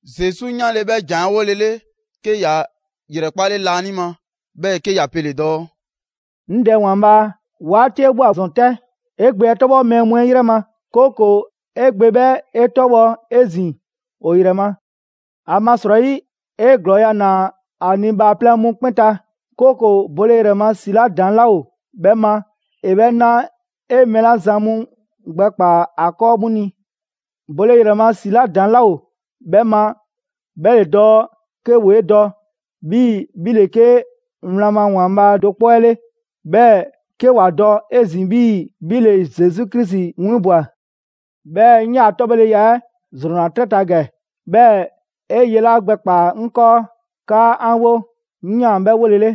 Zesu 'yanle‑ 'bhɛ ‑jan 'ɛ 'wolele, 'ke ‑ya ‑yrɛkpale laanima, 'bhɛɛ‑ 'ke ‑ya pele‑ dɔɔ: «'Ŋ Dɛ ‑Waanbhaa' 'waati 'ɛ ꞊bhwa ‑zɔn 'tɛ. 'E Gbe 'ɛ 'tɔbhɔ mɛɛ mu 'ɛ ‑yrɛ ma, 'kooko‑ 'e Gbe 'bhɛ 'e 'tɔbhɔ 'ezin‑ ‑o ‑yrɛ ma. ‑Amasrɔyi 'e ‑glɔɔya' ‑naa ‑a ni bhaaplɛŋ mu 'kpɛn ta, 'kooko‑ bole ‑yrɛ ma ‑si 'la ‑daŋ' 'laa ‑o 'bhɛ ma ‑e 'bhɛ na 'e mɛɛ 'la zan mu gbɛkpaa‑ ‑a 'kɔɔ 'mu ni. Bole ‑yrɛ ma ‑si 'la ‑daŋ' 'laa ‑o 'bhɛ ma 'bhɛ ‑le dɔɔ 'ke ‑woo 'e dɔ 'bhii‑ 'bhi ‑le 'ke wlan ma ‑Waanbhaa' do 'kpɔ 'ɛ 'le, 'bhɛɛ‑ 'ke ‑wa dɔ 'ezin‑ 'bhii‑ 'bhi ‑le Zesu Krisi 'winbwa‑. 'Bhɛɛ‑ 'ŋ 'yaa‑ 'tɔbhɔleya 'ɛ ‑zrɔnna 'trɛ ta ‑gɛ, 'bhɛɛ‑ 'e ye 'la gbɛkpaa‑ 'ŋ 'kɔɔ 'kaa 'an 'wo, 'ŋ 'yaan‑ 'bhɛ 'wolele.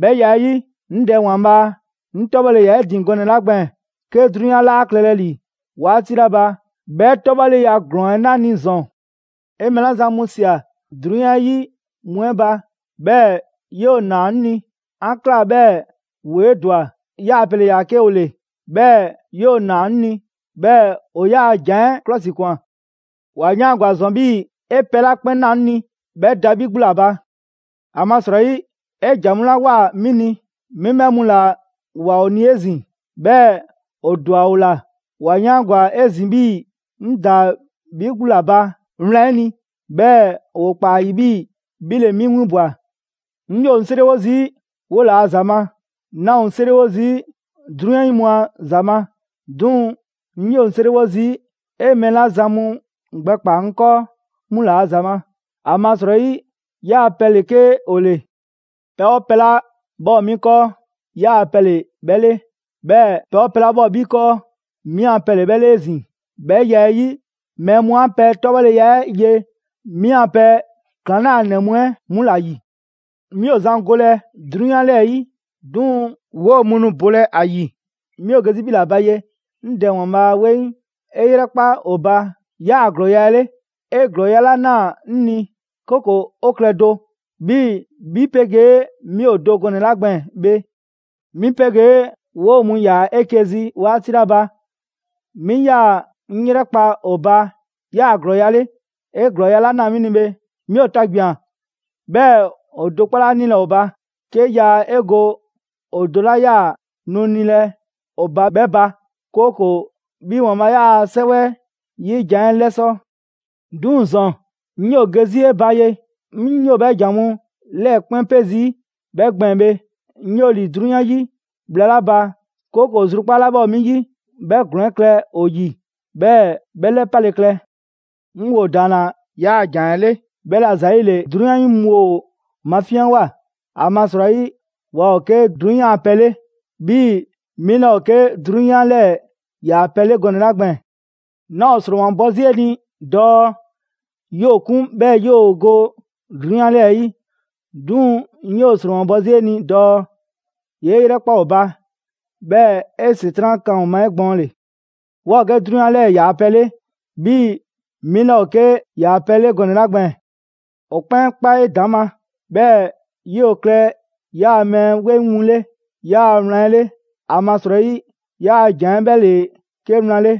'Bhɛ ya 'ɛ 'yi, 'ŋ Dɛ ‑Waanbhaa', 'ŋ 'tɔbhɔle ‑yaa 'e ‑din gɔnɛ‑ 'la gbɛɛn‑ 'ke 'drunyan 'laa klɛlɛ ‑li 'waati 'la ba, 'bhɛ 'tɔbhɔleya ‑glɔɔn 'ɛ 'na 'ŋ ni ‑zɔn.» «'E mɛɛ la zan mu ꞊sia 'drunyan 'ɛ 'yi mu 'ɛ ba, 'bhɛɛ‑ 'yoo‑ ‑naa 'ŋ ni, 'an ꞊kla 'bhɛɛ‑ ‑woo 'e ‑dwa. 'Yaa‑ pɛ ‑le ‑yaa 'ke ‑o ‑le, 'bhɛɛ‑ 'yoo‑ ‑naa 'ŋ ni; 'bhɛɛ‑ ‑o 'yaa‑ ‑jan 'ɛ 'klɔsikwan. ‑Wa 'yaangwa‑ ‑zɔn 'bhii‑ 'e pɛ 'la 'kpɛn ꞊naa 'ŋ ni, 'bhɛ da 'bhi 'gbu ‑la ba. ‑Amasrɔyi 'e ‑jan mu 'la ꞊woa 'mi ni, 'mi 'bhɛ mu ‑la ꞊woa ‑o ni 'ezin‑; 'bhɛɛ‑ ‑o ‑dwa ‑o ‑la. ‑Wa 'yaangwa‑ 'ezin‑ 'bhii‑ 'ŋ ‑daa 'bhi 'gbu ‑la ba wlan 'ɛ ni, 'bhɛɛ‑ ‑woo ‑kpaa ‑a ‑yi 'bhii‑ 'bhi ‑le 'mi 'winbwa‑. «'Ŋ 'yoo‑ 'ŋ 'seriwo zii' 'wola‑ ‑za ma, 'naa ‑o 'ŋ 'seriwo zii' 'drunyan 'yi mu a ‑za ma; 'duŋ‑ 'ŋ 'yoo‑ 'seriwo zii' 'e mɛɛ 'la zan mu gbɛkpaa‑ 'ŋ 'kɔɔ 'mu ‑la ‑za ma, ‑amasrɔyi 'yaa pɛ ‑le 'ke ‑o ‑le. Pɛ 'oo pɛ 'la 'bhɛ ‑o 'mi 'kɔɔ, 'yaa‑ pɛ ‑le 'bhɛ 'le; 'bhɛɛ‑ pɛ 'oo pɛ 'la 'bhɛ ‑o 'bhi 'kɔɔ, 'mi a pɛ ‑le 'bhɛ 'le 'ezin‑. 'Bhɛ ya 'ɛ 'yi, mɛɛ mu 'an pɛ 'tɔbhɔleya 'ɛ ye 'mi a pɛ ‑klaŋlanɛ mu 'ɛ 'mu ‑la ‑yi. 'Mi ‑o zan golɛ 'drunyan 'lɛɛ‑ 'yi, duŋ‑ 'woo‑ mu nu bolɛ ‑a ‑yi. 'Mi ‑o ge 'zi 'bhi ‑la ba ye. 'Ŋ Dɛ ‑Waanbhaa' 'weŋ, 'e 'yrɛkpa ‑o ba 'yaa‑ ‑glɔɔya' 'ɛ 'le, 'e ‑glɔɔya' 'la ꞊naa 'ŋ ni. 'Kooko‑ ‑o klɛ do, 'bhii‑ 'bhi 'pegee 'mi ‑o do gɔnɛ‑ 'la gbɛɛn‑ bhe. 'Mi 'pegee 'woo‑ mu ‑yaa 'eke‑ zi 'waati 'la ba, 'mi 'yaa‑ 'ŋ 'yrɛkpa‑ ‑o ba 'yaa‑ 'ɛ ‑glɔɔya' 'le, 'e ‑glɔɔya' 'la ꞊naa 'mi ni bhe. 'Mi ‑o tagbian‑ 'bhɛɛ‑ ‑o do 'kpɔ 'laa 'nilɛ‑ ‑o ba, 'ke yaa 'e go ‑o do 'la 'yaa‑ nu nilɛ ‑o ba 'bhɛ ba, 'kooko‑ 'bhi ‑Waanbhaa' 'yaa‑ 'Sɛwɛ 'yi jan 'ɛ 'lɛsɔ‑. 'Duŋ‑ ‑zɔn, 'ŋ 'yoo‑ ge 'zi 'e ba ye. 'Ŋ 'yoo‑ 'bhɛ ‑jan mu 'lɛɛ‑ 'kpɛn 'pe zii' 'bhɛ gbɛɛn‑ bhe, 'ŋ 'yoo‑ ‑li 'drunyan 'yi bhla 'la ba, 'kooko‑ zrukpaa' 'la 'bhɛ ‑o 'mi 'yi, 'bhɛ ‑glɔɔn 'ɛ klɛ ‑o ‑yi, 'bhɛɛ‑ 'bhɛ 'lɛpale klɛ. 'Ŋ ‑wo ‑daanna 'yaa‑ ‑jan 'ɛ 'le, 'bhɛla‑ ‑zayile 'drunyan 'yi mu ‑o mafinyanwoa. ‑Amasrɔyi waa ‑o 'ke 'drunyan a pɛ 'le, 'bhii‑ 'mi 'laa ‑o 'ke 'drunyan 'lɛɛ‑ ‑yaa' pɛ 'le gɔnɛ‑ 'la gbɛɛn‑. 'Naa ‑o ‑sromabɔ 'zi 'e ni dɔɔ 'yoo‑ 'kun 'bhɛɛ‑ 'yoo‑ go 'drunyan 'lɛɛ‑ 'yi, 'duŋ‑ 'ŋ 'yoo‑ ‑sromabɔ 'zi 'e ni dɔɔ 'yee 'yrɛkpa‑ ‑o ba, 'bhɛɛ‑ 'e ‑Setran' 'kan ‑o ma 'egbɔɔnle. Waa ‑o 'ke 'drunyan 'lɛɛ‑ ‑yaa' pɛ 'le, 'bhii‑ 'mi 'laa ‑o 'ke ‑yaa' pɛ 'le gɔnɛ‑ 'la gbɛɛn‑. ‑O 'kpɛn 'kpa 'edaŋma, 'bhɛɛ 'yoo‑ klɛ 'yaa mɛɛ 'weŋ mu 'le 'yaa‑ wlan 'ɛ 'le. ‑Amasrɔyi 'yaa‑ ‑jan 'ɛ 'bhɛ ‑le 'ke wlan 'le.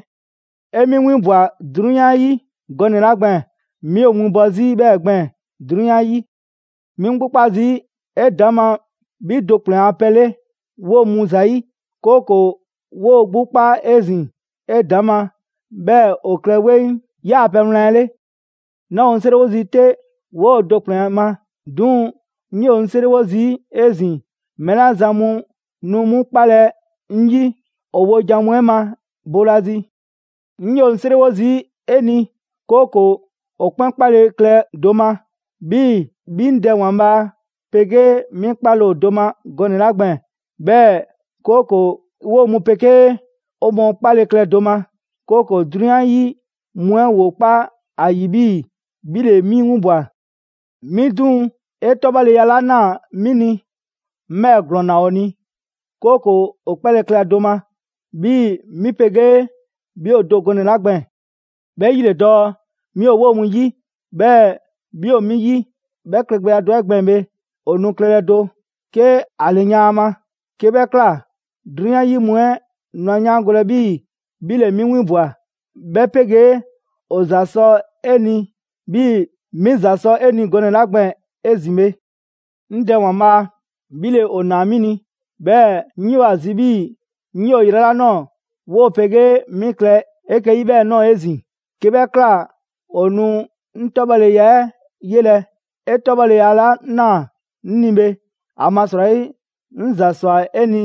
'E 'mi 'winbwa‑ 'drunyan 'yi gɔnɛ‑ 'la gbɛɛn‑, 'mi ‑o winbɔ 'zi 'bhɛɛ‑ gbɛɛn‑ 'drunyan 'ɛ 'yi. 'Mi 'ŋ 'gbu 'kpa zii' 'edaŋma 'bhi do ‑kplɛn ‑a pɛ 'le 'woo‑ mu ‑zayi', 'kooko‑ 'woo‑ 'gbu kpa 'ezin‑ 'edaŋma, 'bhɛɛ‑ ‑o klɛ 'weŋ 'yaa‑ pɛ wlan 'ɛ 'le.» «'Naa ‑o 'ŋ 'seriwo zii' 'te 'woo‑ do 'kpɛn ma; 'duŋ‑ 'ŋ 'yoo‑ 'ŋ 'seriwo zii' 'ezin‑ mɛɛ 'la zan mu nu 'mu 'kpalɛ‑ 'ŋ 'yi ‑o wojan mu 'ɛ ma boolazi. 'Ŋ 'yoo‑ 'ŋ 'seriwo zii' 'e ni, 'kooko‑ ‑o 'kpɛn 'kpale‑ klɛ do ma, 'bhii‑ 'bhi 'ŋ Dɛ ‑Waanbhaa' 'pegee 'mi 'kpale‑ ‑o do ma gɔnɛ‑ 'la gbɛɛn‑. 'Bhɛɛ‑ 'kooko‑ 'woo‑ mu 'pegee 'o mɔɔ 'kpale‑ klɛ do ma, 'kooko‑ 'drunyan 'yi mu 'ɛ ‑woo kpa ‑a ‑yi 'bhii‑ 'bhi ‑le 'mi 'winbwa‑. 'Mi 'duŋ‑, 'e 'tɔbhɔleya 'la ꞊naa 'mi ni, 'ŋ 'bhɛɛ‑ ‑glɔɔn ꞊naa ‑o ni, 'kooko‑ ‑o 'kpale‑ klɛ do ma, 'bhii‑ 'mi 'pegee 'bhi ‑o do gɔnɛ‑ 'la gbɛɛn‑. 'Bhɛ 'yi ‑le dɔɔ: 'mi ‑o 'woo‑ mu 'yi, 'bhɛɛ‑ 'bhi ‑o 'mi 'yi; 'bhɛ klɛgbɛya 'ɛ gbɛɛn‑ bhe, ‑o nu klɛlɛ do, 'ke ‑a ‑lɛyan' a ma. 'Ke 'bhɛ ꞊kla, 'drunyan 'yi mu 'ɛ nu ‑a 'yaangolɛ 'bhii‑ 'bhi ‑le 'mi winbwa‑, 'bhɛ 'pegee ‑o ‑za sɔ 'e ni 'bhii‑ 'mi ‑za sɔ 'e ni gɔnɛ‑ 'la gbɛɛn‑ 'ezin‑ bhe. 'Ŋ Dɛ ‑Waanbhaa', 'bhi ‑le ‑o ‑naa 'mi ni. 'Bhɛɛ‑ 'ŋ 'yoo‑ ‑a zi 'bhii‑ 'ŋ ‑yoo yrɛ 'la ꞊nɔɔ 'woo‑ 'pegee 'mi klɛ 'eke‑ 'yi 'bhɛɛ‑ ꞊nɔɔ 'ezin‑. 'Ke 'bhɛ ꞊kla ‑o nu 'ŋ 'tɔbhɔleya 'ɛ 'yelɛ‑, 'e 'tɔbhɔleya 'la ꞊naa 'ŋ ni bhe. ‑Amasrɔyi 'ŋ ‑za ‑swa 'e ni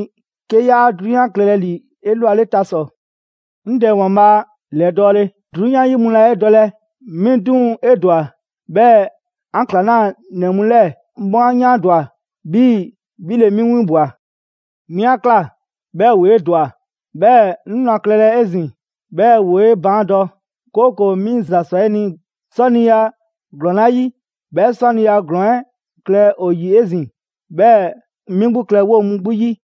'ke 'yaa 'drunyan klɛlɛ ‑li 'elwale ta ‑sɔ. 'Ŋ Dɛ ‑Waanbhaa' ‑lɛdɔɔle, 'drunyan 'yi mu laa 'e dɔlɛ; 'mi 'duŋ‑ 'e ‑dwa; 'bhɛɛ‑ 'an ‑klaŋlanɛ mu 'lɛɛ‑ 'mu 'a 'yaandwa‑ 'bhii‑ 'bhi ‑le 'mi 'winbwa‑. 'Mi 'a ꞊kla 'bhɛɛ‑ ‑woo 'e ‑dwa, 'bhɛɛ‑ 'ŋ nu a klɛlɛ 'ezin‑ 'bhɛɛ‑ ‑woo 'e baan' dɔ, 'kooko‑ 'mi ‑za ꞊swa 'e ni 'sɔniya ‑glɔɔn 'la 'yi, 'bhɛ 'sɔniya ‑glɔɔn 'ɛ klɛ ‑o ‑yi 'ezin‑, 'bhɛɛ‑ 'mi 'gbu klɛ 'woo‑ mu 'gbu 'yi.»